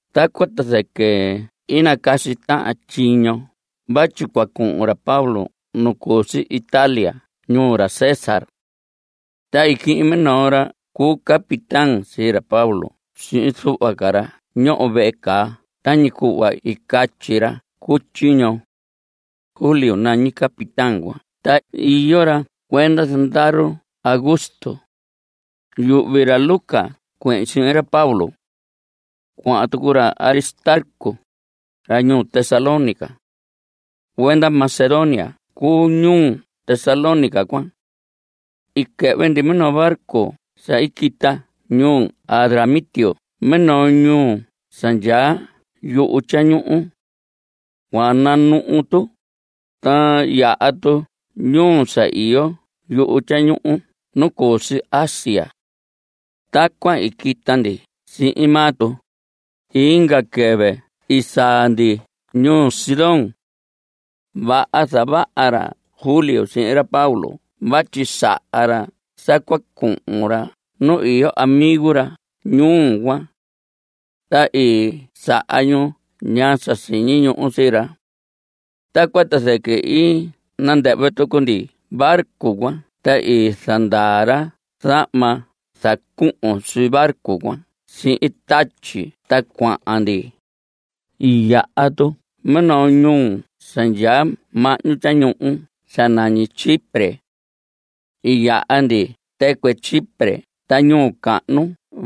Tacuan ta zɨquɨ i nacasi tahan tyiño vatyi cua cuhun ra Pablo nu cu si Italia nuu ra César. Ta i quihin minoo ra cu capitán sii ra Pablo sihin zuhva ca ra ñoho vehe caa tañi cuhva i catyi ra cu tyiño. Julio nañi capitán cuan ta iyo ra cuenda zandaru ra Augusto. Yuhvi ra Lucas cuehin sihin ra Pablo. Cuahan tucu ra Aristarco, ra ñuu Tesalónica. Cuenda Macedonia cuu ñuu Tesalónica cuan. I quɨhvɨ ndi minoo barco sa i quita ñuu Adramitio minoo ñuu sa ndyaa yuhu tyañuhu. Cua nanuhu tu, ta yaha tu ñuu sa iyo yuhu tyañuhu nu cu si Asia. Tacuan i quita ndi sihin maa tu. Inga quɨvɨ i saa ndi ñuu Sidón. Vaha zavaha ra Julio sihin ra Pablo vatyi saha ra sa cua cuhun ra nu iyo amigo ra ñuu cuan. Ta i saha ñu ñaa sa siñi ñuhu sii ra. Tacuan ta zɨquɨ i nandɨhvɨ tucu ndi barco cuan ta i zandaa ra zahma sa zacuhun sii barco cuan sihin tatyi ta cuahan ndi. I yaha tu minoo ñuhu sa ndyaa mahñu tyañuhu sa nañi Chipre. I yaha ndi tɨcuɨ Chipre ta ñuhu cahnu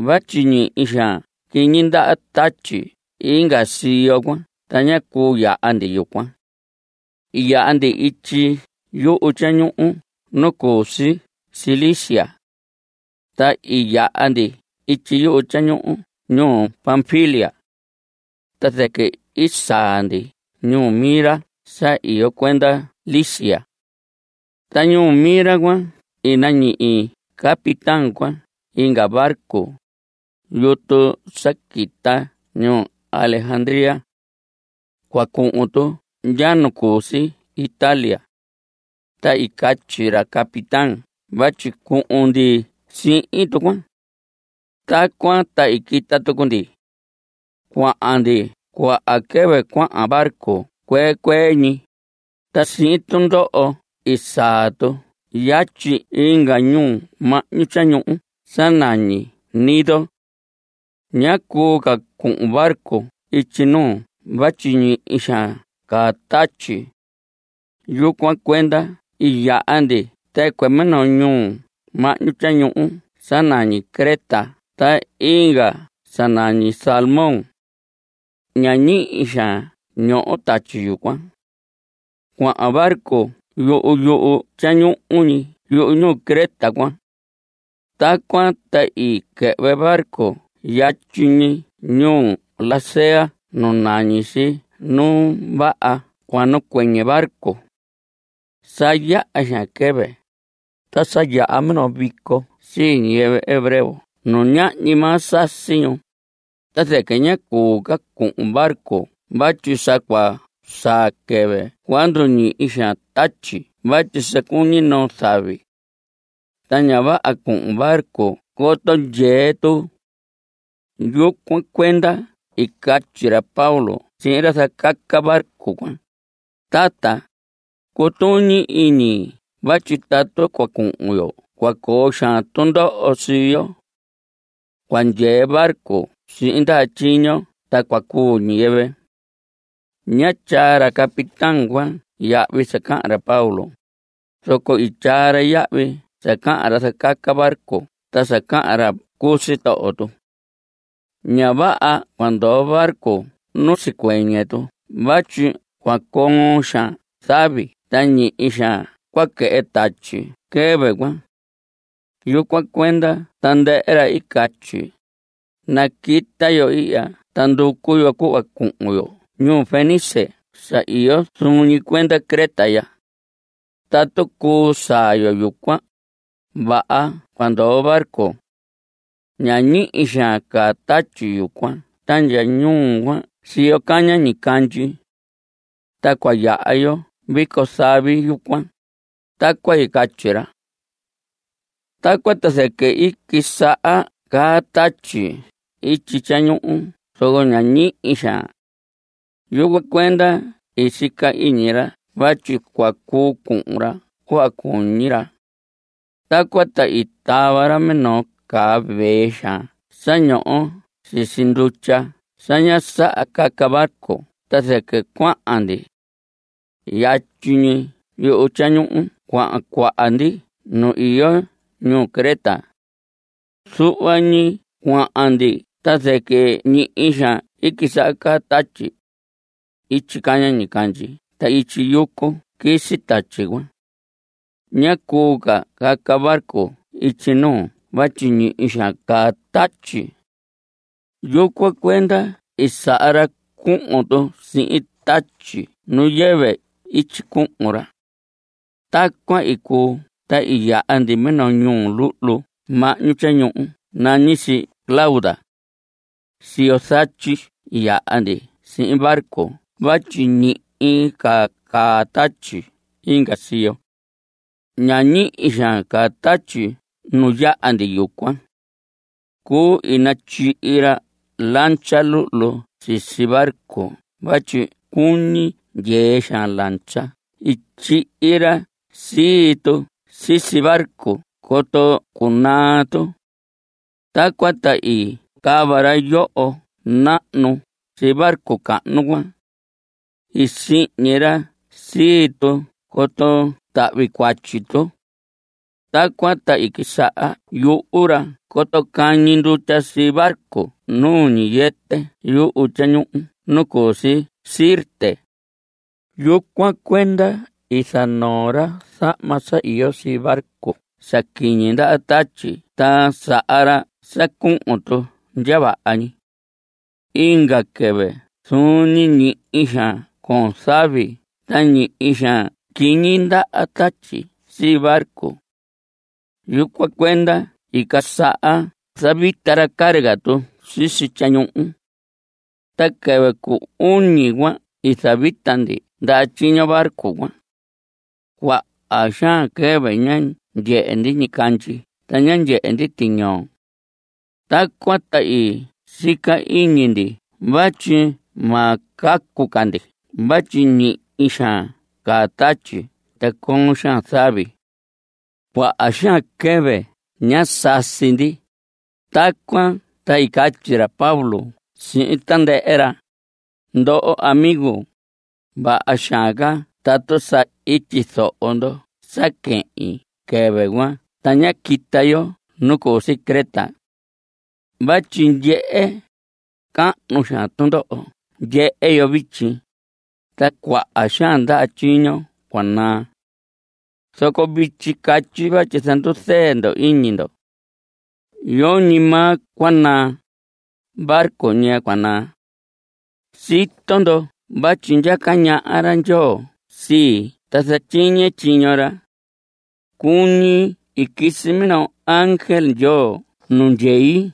vatyi ñihi xaan quiñi ndaha tatyi inga siyo cuan ta ñá cuu yaha ndi yucuan. I yaha ndi ityi yuhu tyañuhu nu cu si Cilicia. Ta i yaha ndi ityi yuhu tyañuhu ñuu Panfilia. Ta zɨquɨ i saa ndi ñuu Mira sa iyo cuenda Licia. Ta ñuu Mira cuan i nañihi capitán cuan inga barco, yutu sa quita ñuu Alejandría. Cua cuhun tu ndya nu cu si Italia. Ta i catyi ra capitán vatyi cuhun ndi sihin tu cuan. Tacuan ta i quita tucu ndi cuahan ndi. Cuaha quɨvɨ cuahan barco cuee cuee ñi, ta sihin tundoho i saa tu yatyi inga ñuhu mahñu tyañuhu sa nañi Gnido. Ñá cuu ca cuhun barco ityi nuu vatyi ñihi xaan caa tatyi. Yucuan cuenda i yaha ndi tɨcuɨ minoo ñuhu mahñu tyañuhu sa nañi Creta ta inga sa nañi Salmón. Ña ñihi xaan ñoho tatyi yucuan. Cuahan barco yuhu yuhu tyañuhu ñi yuhu ñuhu Creta cuan. Tacuan ta i quɨhvɨ barco yatyi ñi ñuu Lasea nu nañi si Nu Vaha Cua Nacuɨñɨ Barco. Sa yaha xaan quɨvɨ, ta sa yaha minoo vico sii ñiyɨvɨ hebreo nu ñahñi maa sasi ñu, ta zɨquɨ ñá cuu ca cuhun barco vatyi sa cua saa quɨvɨ cua nduñihi xaan tatyi vatyi sa cuñi noo zavi. Ta ña vaha cuhun barco coto ndyee tu. Yucuan cuenda i catyi ra Pablo sihin ra zacaca barco cuan: Tata, cutuñi iñi vatyi tatu cua cuhun yo cua coo xaan tundoho sii yo. Cua ndyee barco sihin ndaha tyiño ta cua cuu ñiyɨvɨ. Ñá tyaa ra capitán cuan yahvi sa cahan ra Pablo, zoco i tyaa ra yahvi sa cahan ra zacaca barco ta sa cahan ra cu sitoho tu. Ña vaha cua ndoo barco nu sicuɨñɨ tu vatyi cua coon xaan zavi ta ñihi xaan cua quɨhɨ tatyi quɨvɨ cuan. Yucuan cuenda tandɨhɨ ra i catyi: Naquita yo ihya ta nducu yo cuhva cuhun yo ñuu Fenice sa iyo zuun ñi cuenda Creta ya. Tatu cuu saa yo yucuan, vaha cua ndoo barco. Ña ñihi xaan caa tatyi yucuan ta ndyaa ñuu cuan siyo caña ñicandyi. Ta cua yaha yo vico zavi yucuan. Tacuan i catyi ra. Tacuan ta zɨquɨ i quisaha caa tatyi ityi tyañuhu zoco ña ñihi xaan. Yucuan cuenda i sica iñi ra vatyi cua cuu cuhun ra cuhva cuñi ra. Tacuan ta i tava ra minoo caa vee xaan sa ñoho sisi ndutya sa ña saha caca barco ta zɨquɨ cuahan ndi. Yatyi ñi yuhu tyañuhu cuan cuahan ndi nu iyo ñuhu Creta. Zuhva ñi cuahan ndi ta zɨquɨ ñihi xaan quisaha caa tatyi. Ityi caña ñicandyi ta ityi yucu quisi tatyi cuan. Ñá cuu ca caca barco ityi nuu vatyi ñihi xaan caa tatyi. Yucuan cuenda i saha ra cuhun tu sihin tatyi nu yɨvɨ ityi cuhun ra. Tacuan i cuu ta i yaha ndi minoo ñuhu luhlu mahñu tyañuhu nañi si Clauda. Siyo zatyi i yaha ndi sihin barco vatyi ñihi ca caa tatyi inga siyo. Ña ñihi xaan caa tatyi nu yaha ndi yucuan. Cuu, i natyihi ra lancha luhlu sisi barco vatyi cuñi ndyee xaan lancha. I tyihi ra sii tu sisi barco coto cunaa tu. Tacuan ta i cava ra yoho nahnu sii barco cahnu cuan. I sihñi ra sii tu coto tahvi cuatyi tu. Tacuan ta i quisaha yuhu ra coto cañi ndutya sii barco nu ñiyɨtɨ yuhu tyañuhu nu cu si Sirte. Yucuan cuenda i zanoo ra zahma sa iyo sii barco sa quiñi ndaha tatyi ta saha ra sa cuhun tu ndya vaha ñi. Inga quɨvɨ zuun ñi ñihi xaan coon zavi ta ñihi xaan quiñi ndaha tatyi sii barco. Yucuan cuenda i casaha zavita ra carga tu sisi tyañuhu. Ta quɨvɨ cu uñi cuan i zavita ndi ndaha tyiño barco cuan. Cuaha xaan quɨvɨ ñá ndyehe ndi ñicandyi ta ñá ndyehe ndi tiñoo. Tacuan ta i sica iñi ndi vatyi ma cacu ca ndi vatyi ñihi xaan caa tatyi ta coon xaan zavi. Cuaha xaan quɨvɨ ñá sasi ndi. Tacuan ta i catyi ra Pablo sihin tandɨhɨ ra: Ndoho amigo, vaha xaan ca tatu sa i tyizoho ndo sa quehin quɨvɨ cuan ta ñá quita yo nu cu si Creta. Vatyi ndyehe, cahnu xaan tundoho ndyehe yo vityi, ta cuaha xaan ndaha tyiño cua naa. Zoco vityi catyi vatyi zanduzɨɨ ndo iñi ndo. Yoñi maa cua naa. Barco ñi cua naa. Sito ndo vatyi ndyaca ñaha ra Ndyoo sii ta zatyiñe tyiño ra. Cuñi i quisi minoo ángel Ndyoo nu ndyei.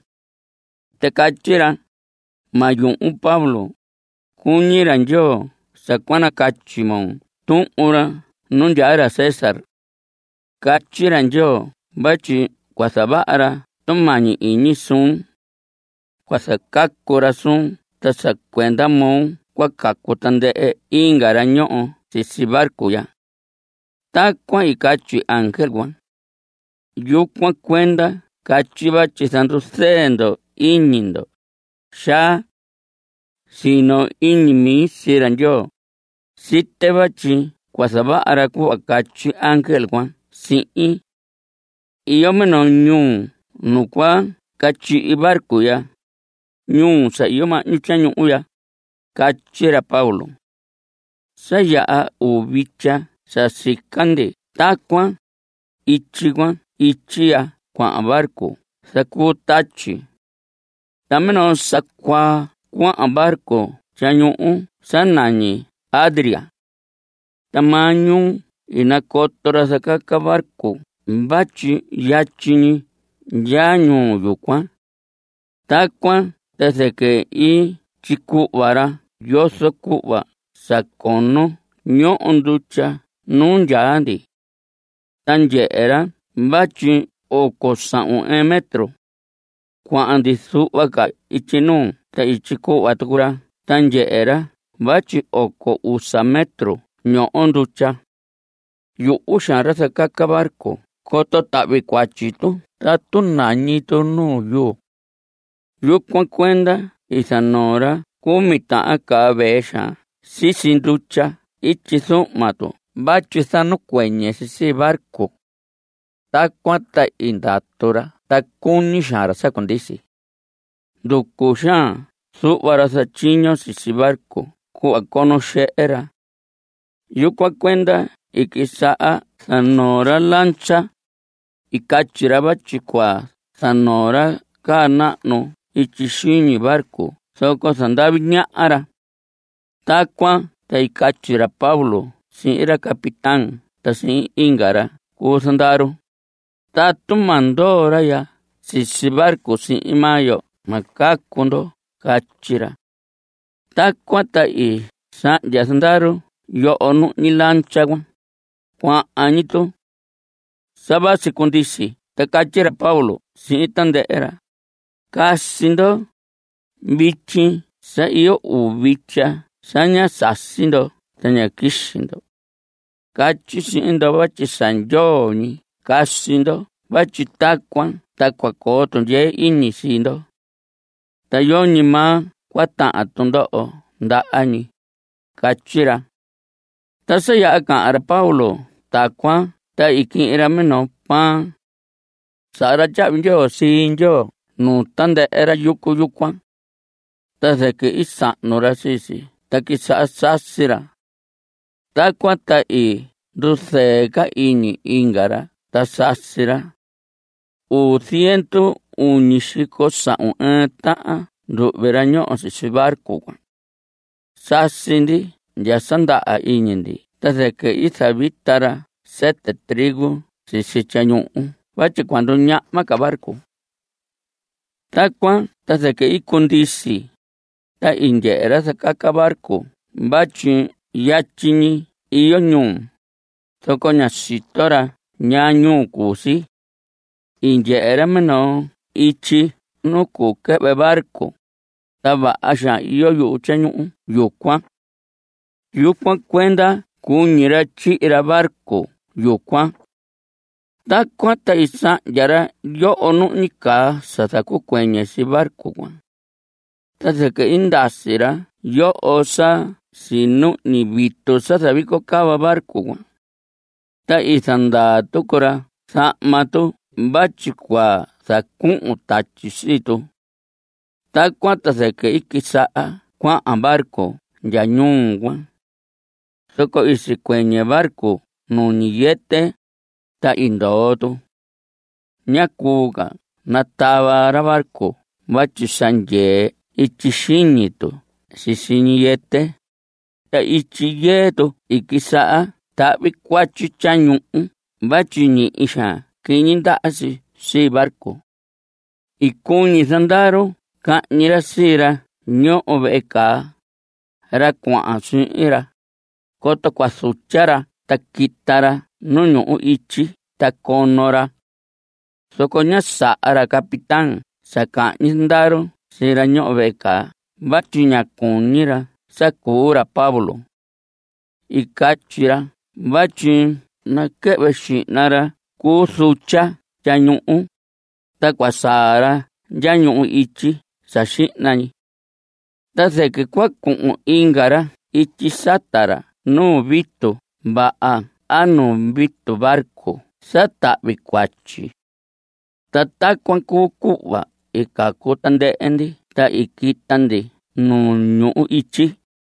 Ta catyi ra: “Ma yuhun Pablo. Cuñi ra Ndyoo sa cua nacatyi moo tuhun ra nu ndyaa ra César. Catyi ra Ndyoo vatyi cua zavaha ra tumañi iñi suun. Cua zacacu ra suun ta sa cuenda moo cua cacu tandɨhɨ inga ra ñoho sisi barco ya.” Tacuan i catyi ángel cuan. Yucuan cuenda catyi vatyi zanduzɨɨ ndo iñi ndo, xaa. Sino iñi mi sii ra Ndyoo. Site vatyi cua zavaha ra cuhva catyi ángel cuan sihin. Iyo minoo ñuhu nu cua catyihi barco ya, ñuhu sa iyo mahñu tyañuhu ya. Catyi ra Pablo. Sa yaha uu vitya sa sica ndi tacuan. Ityi cuan ityi ya cuahan barco zacuu tatyi. Ta minoo sa cuaa cuahan barco tyañuhu sa nañi Adria. Ta maañuu i nacoto ra zacaca barco vatyi yatyi ñi ndya ñuhu yucuan. Tacuan ta zɨquɨ i tyicuhva ra yozo cuhva sa cono ñoho ndutya nu yaha ndi. Ta ndyehe ra vatyi oco sahun ɨɨn metro. Cuahan ndi zuhva ca ityi nuu, ta i tyicuhva tucu ra ta ndyehe ra vatyi oco usa metro ñoho ndutya. Yuhu xaan ra zacaca barco coto tahvi cuatyi tu tatu nañi tu nu yuu. Yucuan cuenda i zanoo ra cumi tahan caa vee xaan sisi ndutya ityi zuhma tu vatyi zanacuɨñɨ si sii barco. Tacuan ta i ndatu ra ta cuñi xaan ra sa cundisi. Nducu xaan zuhva ra zatyiño sisi barco cuhva cono xehe ra. Yucuan cuenda i quisaha zanoo ra lancha. I catyi ra vatyi cua zanoo ra caa nahnu ityi xiñi barco zoco zandavi ñaha ra. Tacuan ta i catyi ra Pablo sihin ra capitán ta sihin inga ra cu zandaru: Tatu ma ndoo ra ya sisi barco sihin maa yo ma cacu ndo. Catyi ra. Tacuan ta i sahndya zandaru yoho nuhñi lancha cuan. Cuahan ñi tu. Sa vasi cundisi ta catyi ra Pablo sihin tandɨhɨ ra: Casi ndo. Vityi sa iyo uu vitya sa ñá sasi ndo ta ñá quixi ndo. Catyi sihin ndo vatyi sa ndyoo ñi casi ndo vatyi tacuan ta cua coo tundyee iñi sii ndo. Ta yoñi maa cua tahan tundoho ndaha ñi. Catyi ra. Ta sa yaha cahan ra Pablo tacuan ta i quihin ra minoo pan. Saha ra tyahvi ndyoo sii Ndyoo nuu tandɨhɨ ra yucu yucuan. Ta zɨquɨ i sahnu ra sii si ta quisaha sasi ra. Tacuan ta i nduzɨɨ ca iñi inga ra ta sasi ra. Uu ziendu uñi xico sahun ɨɨn tahan nduhvi ra ñoho sisi barco cuan. Sasi ndi ndya sa ndaha iñi ndi ta zɨquɨ i zavita ra sɨtɨ trigo sisi tyañuhu vatyi cua nduñahma ca barco. Tacuan ta zɨquɨ i cundisi, ta i ndyehe ra zacaca barco vatyi yatyi ñi iyo ñuhu, zoco ñá sito ra ñaa ñuhu cuu si. I ndyehe ra minoo ityi nu cuu quɨhvɨ barco, ta vaha xaan iyo yuhu tyañuhu yucuan. Yucuan cuenda cuñi ra tyihi ra barco yucuan. Tacuan ta i sahndya ra yoho nuhñi caa sa zacuɨñɨ sii barco cuan. Ta zɨquɨ i ndasi ra yoho sa sinuhñi vitu sa zavico cava barco. Ta i zandaa tucu ra zahma tu vatyi cua zacuhun tatyi sii tu. Tacuan ta zɨquɨ i quisaha cuahan barco ndya ñuhu cuan. Zoco i sicuɨñɨ barco nu ñiyɨtɨ, ta i ndoo tu. Ñá cuu ca natava ra barco vatyi sa ndyee ityi xiñi tu sisi ñiyɨtɨ, ta ityi yɨɨ tu i quisaha tahvi cuatyi tyañuhu vatyi ñihi xaan quiñi ndaha si sii barco. I cuñi zandaru cahñi ra sii ra ñoho vehe caa, ra cuahan sihin ra, coto cua zutya ra ta quita ra nu ñuhu ityi ta cono ra. Zoco ñá saha ra capitán sa cahñi zandaru sii ra ñoho vehe caa vatyi ñá cuñi ra sa cuu ra Pablo. I catyi ra vatyi naquɨhvɨ xihna ra cuu zutya tyañuhu, ta cua saa ra ndya ñuhu ityi sa xihna ñi. Ta zɨquɨ cua cuhun inga ra ityi sata ra nu vitu vaha a nu vitu barco sa tahvi cuatyi. Ta tacuan cuu cuhva i cacu tandɨhɨ ndi ta i quita ndi nu ñuhu ityi.